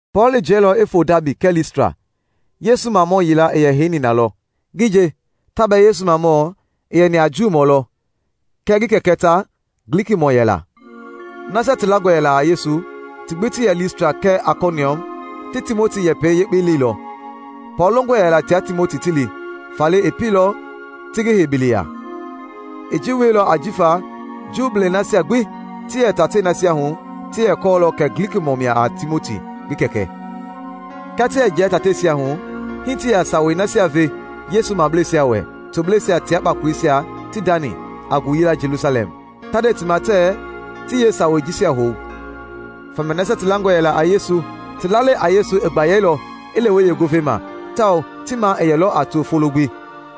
Pɔɔl i jiɛilɔ i foo Daabi kɛɛ Listra. Yesu mamɔ yila i yɛ heini na lɔ; ngi nje, ta bɛɛ Yesu maamɔɔ, i yɛni a Juumɔ lɔ, kɛɛ ngi kɛkɛ ta Glikimɔɔ yɛla. Nasia ti langɔ yɛla a Yesu ti gbi ti yɛ Listra kɛɛ Aikoniɔm ti Timoti yɛpɛ yekpe leilɔ. Pɔɔl longɔ yɛla tia Timoti ti li, faale i pieilɔ ti ngi hei biliya. I ji wieilɔ ajifa Juu nasia gbi ti yɛ tatei nasia hu ti yɛ kɔɔlɔ kɛ Glikimɔɔ mia a Timoti ngi kɛkɛ. Kia ti yɛ jia tateisia hu, hii ti yɛ sawei nasia ve Yesu mableisia wɛ tobleisia tia kpakoleisia ti ndani a ngooyila Jelusalɛm, ta nde ti ma tɛɛ ti yeesawei jisia hou. Famia nasia ti langɔ yɛla a Yesu ti lalei a Yesu i gbayeilɔ i lewe yeengovei ma tawao ti maa i yɛlɔ a to folo gbi.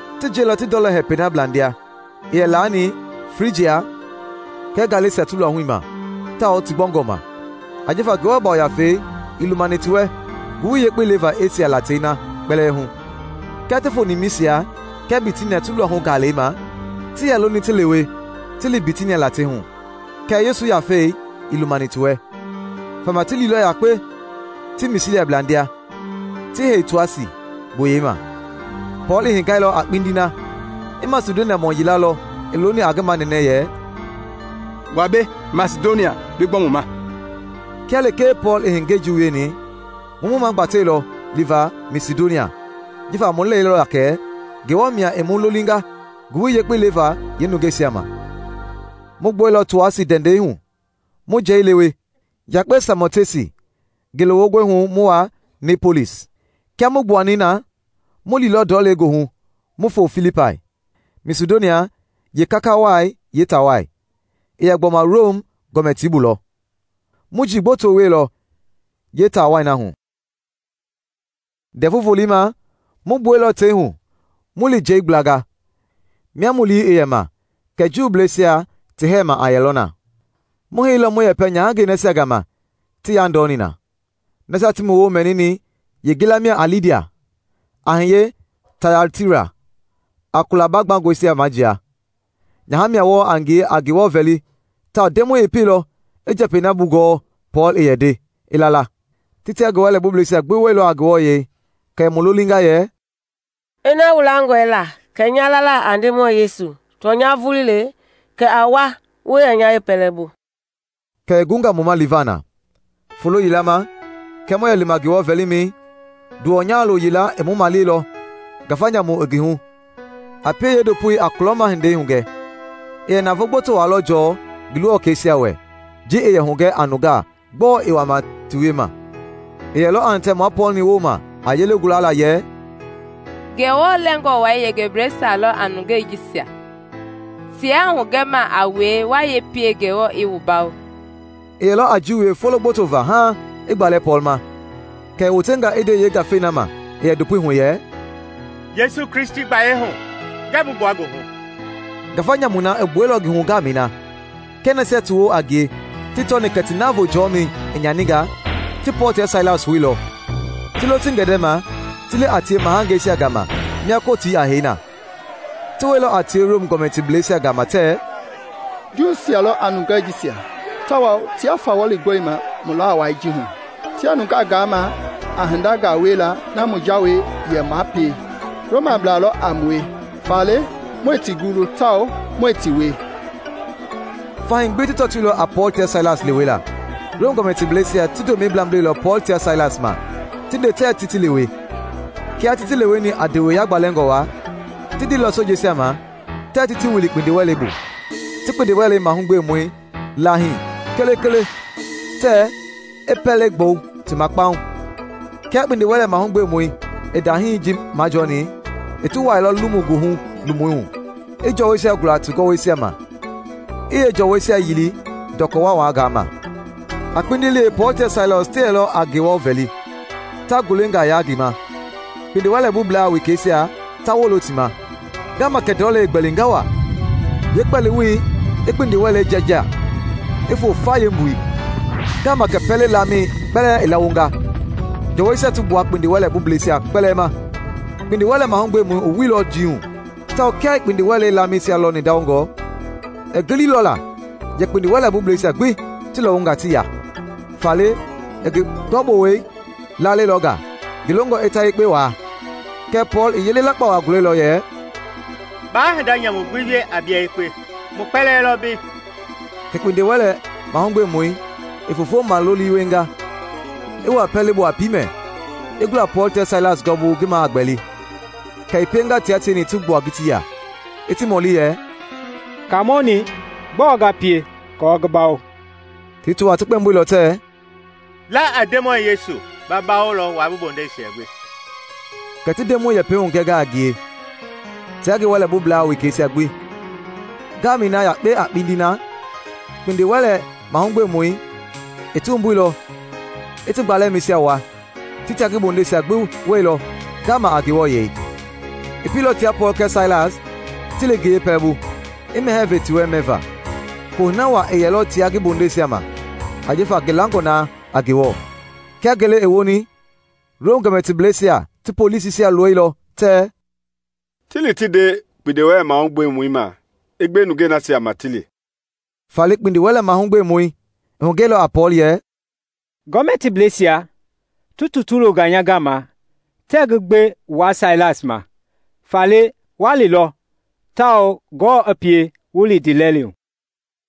Ti jiɛilɔ ti ndɔlɔ hɛpɛi na blandia i yɛ laani Frijia kɛɛ Galesia ti luahui ma tawao ti gbɔngɔ ma, ajifa Ngewɔ Yafei ii lumani ti wɛ Ngowili Yekpei leva Esia latei na kpɛlɛɛ hu. Kia ti foni Misia kɛɛ Bitinia ti luahu-gaalɛi ma, ti yɛ loni ti lewe ti li Bitinia latei hu, kɛɛ Yesu Yafei ii lumani ti wɛ. Famia ti liilɔ yakpe ti Misia blandia, ti yei Toasi, gboyei ma. Pɔɔl i hengailɔ a kpindi na, i Masidoniamɔ yila lɔ i looni a ngi manɛnɛ yɛ, “Wa mbei Masidonia bi gbɔ mu ma!” Kia lekee Pɔɔl i hengei ji wieni, mu mu magbateilɔ liva Masidonia, jifa mu lɛilɔ la kɛ Ngewɔ mia i mu lolinga Ngowili Yekpei leva yeenungeisia ma. Mu gbuɛilɔ Toasi ndɛndɛi hu mu njɛi lewe yakpe Samotesi, ngele wongɔi hu mu wa Niepolis. Kia mu gbuani na mu liilɔ ndɔlei goohu mu foo Filipai, Masidonia yeekaka wai yeetaa wai; i yɛ gbɔma Rom gɔmɛtii bu lɔ. Mu njii gboto wieilɔ yeetaa wai na hu. Ndɛvu Volei ma mu gbuɛilɔ tei hu mu li njɛi gblanga, mia mu lii i yɛ ma kɛ Juuisia ti hɛɛma a yɛlɔ na. Mu heiilɔ mu yɛpɛ nyahangɛi nasia gama ti yandɔni na. Nasia ti mu woo mɛnini yeengila mia a Lidia, a hiye Tayatira, a kula baagbangɔisia majia. Nyaha mia wɔɔ a ngie a Ngewɔ vɛli tawao Ndemɔi i pielɔ i njɛpɛi na bugɔɔ Pɔɔl i yɛ nde, i la la. Ti tia ngi wɛlɛbubleisia gbi wuɛilɔ, kɛ i mu lolinga yɛ, “Ina wu langɔe la kɛ nya lala a Ndemɔi Yesu tɔnya vulii le, kɛ a wa wu yɛ nya yeepɛlɛbu.” Kɛ i gunga mu ma liva na. Folo yila ma, kia mu yɛ lima Ngewɔ vɛlimɛi, nduwɔ nyahalo yila i mu maleilɔ, ngafa nyamu i ngi hu, a pie yeendopoi a kulɔma hindei hugɛ. I yɛ navoo gboto waa lɔ jɔɔ ngi luwɔkɛisia wɛ ji i yɛ hugɛ a nungaa gbɔɔ i wama ti wiema. I yɛlɔ a hitɛ mua Pɔɔl-ni wooma a yelei gula yɛ, “Ngewɔ Lɛngɔ Wai yengebleisia lɔ a nungei jisia! Tiaa hugɛma a wue wa yee pie Ngewɔ i wu bawo!” I yɛlɔ a ji wie folo gboto va haaŋ i gbalɛ Pɔɔl ma, kɛ i wotenga i nde yeengafei na ma i yɛ ndopoi hu yɛ, “Yesu Kristi gbayei hu ngɛɛ bi gbua ngi hu!” Ngafa nyamui na i gbuɛilɔ ngi hu ngaamɛi na. Kia nasia ti woo a ngie ti tɔni kɛ ti navoo jɔmɛi i nyaninga, ti Pɔɔl tia Sailas houilɔ, ti lo ti gɛndɛma ti li a tie mahangeisia gama mia Kotii a hei na. Ti wɛilɔ a tie Rom gɔmɛtiblɛisia gama tɛɛ, “Juuisia lɔ a nungei jisia tawao tiaa fawɔli gɔlima mu laa wai ji hu. Tiaa nungaa gaama a hindangaa wiela na mu jawei yɛ maa pie; Romablaa lɔ a mue faale muɛɛ ti gulu tawao muɛɛ ti wie.” Fahii gbi ti tɔtoilɔ a Pɔɔl tia Sailas lewela. Rom gɔmɛtiblɛisia ti ndomɛi blamblɛilɔ Pɔɔl tia Sailas ma ti nde tɛɛ ti ti lewe. Kia ti ti leweni a ndewe yagbalɛngɔ waa, ti ndeilɔ sojeisia ma tɛɛ ti ti wili kpindiwɛlei bu, ti kpindiwɛlɛ mahugbemɔi laahii kelekele tɛɛ i pɛlei gbɔu ti ma kpaŋ. Kia kpindiwɛlɛ mahugbemɔi i ndahii ji majɔɔni, i ti wuailɔ lomu-goohu-lomui hu, i jɔwɔisia gula ti gɔwɔisia ma, i yeejɔɔwɔisia yili ndɔkɔ waawangaa ma. A kpindiliɛi Pɔɔl tia Sailas ti yɛlɔ a Ngewɔ vɛli, ta ngulengaa yaa ngi ma, kpindiwɛlɛbublaa wekeisia ta wolo ti ma. Ngaama kɛ ndɔlɛi i gbɛlinga waa, yeekpɛliwoi i kpindiwɛlei jɛɛjia i foo fa yeembui. Ngaama kɛ pɛlɛ-laamɛi kpɛlɛɛ i lawonga, jɔwɔisia ti gbua kpindiwɛlɛbubleisia kpɛlɛɛ ma. Kpindiwɛlɛ-mahugbemɔi i wuilɔ njii hu tawao kia i kpindiwɛlei laamɛisia lɔni ndawongɔ, i giliilɔ la yɛ kpindiwɛlɛbubleisia gbi ti lɔwunga ti ya, faale i ngi gɔbowɛi laalɛilɔ nga, ngi longɔ i ta yekpe waa. Kɛɛ Pɔɔl i yele lakpa waa gulɛilɔ yɛ, “Baa hinda nyamu gbi wie a bia yekpe! Mu kpɛlɛɛ lɔ mbei!” Kɛ kpindiwɛlɛ-mahugbemɔi i foofo maloli wienga, i wuaa pɛlei bu a piimɛ, i gula Pɔɔl tia Sailas gɔɔbu ngi maa a gbɛli. Kɛ i pienga tia tieni ti gbua ngitii ya, i ti mɔli yɛ, “Kaamɔ-ni, gbɔɔ nga pie aako ngi bawo?” Ti kpɛmboilɔ tɛɛ, “La a Ndemɔi Yesu; ba bawolɔ wua bi bondeisia gbi.” Kɛ ti Ndemɔi Yɛpɛi hugɛnga a ngie tia ngi wɛlɛbublaa wekeisia gbi. Ngaamɛi na yakpe a kpindi na kpindiwɛlɛ-mahugbemɔi i ti wumbuilɔ i ti gbalɛmɛisia wua; ti tia ngi bondeisia gbi wuɛilɔ ngaama. I pieilɔ tia Pɔɔl kɛɛ Sailas ti li ngi yeepɛlɛbu, i mɛhɛɛ ve ti wɛ mɛva. Kohunɛ waa i yɛilɔ tia ngi bondeisia ma ajifa ngi langɔ na a Ngewɔ. Kia ngele i woni Rom gɔmɛtiblɛisia ti polisisia loilɔ tɛɛ, “Ti li ti nde kpindiwɛlɛ-mahugbemɔi ma i gbe nungei nasia ma ti li.” Faale kpindiwɛlɛ-mahugbemɔi i hugɛilɔ a Pɔɔl yɛ, “Gɔmɛtiblɛisia ti tutu longa nya gama tɛɛ ngi gbe wua Sailas ma. Faale wa lilɔ, tawao Ngewɔ i pie wu li ndiilɛli hu.”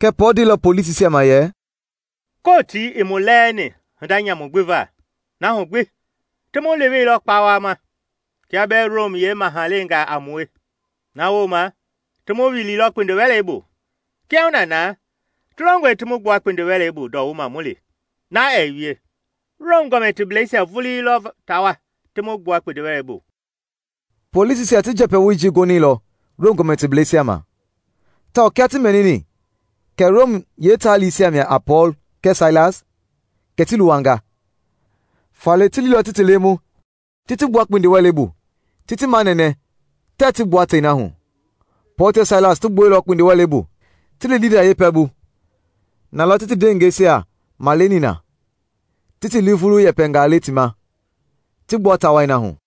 Kɛɛ Pɔɔl ndeilɔ polisisia ma yɛ, “Kotii ii mu lɛɛni hinda nyamu gbi va, na hu gbi ti mu leweilɔ kpawama -- kia bɛɛ Rom yeemahalengaa a mue! Na wooma ti mu wiliilɔ kpindiwɛlei bu. Kiahuna na ti longɔe ti mu gbua kpindiwɛlei bu ndɔwuma mu li? Na ɛɛ wie! Rom gɔmɛtiblɛisia vulii lɔ ta wa ti mu gbua kpindiwɛlei bu.” Polisisia ti njɛpɛwoi ji gonɛilɔ Rom gɔmɛtiblɛisia ma; tawao kia ti mɛnini kɛ Rom yeetaalisia mia a Pɔɔl kɛɛ Sailas, kɛ ti luwanga. Faale ti liilɔ ti ti lemu, ti ti gbua kpindiwɛlei bu, ti ti manɛnɛ tɛɛ ti gbua tei na hu. Pɔɔl tia Sailas ti gbuɛilɔ kpindiwɛlei bu, ti li Lidia yeepɛlɛbu. Na lɔ ti ndewengeisia maleni na, ti ti lii vulu yɛpɛngaa le ti ma, ti gbua taa wai na hu.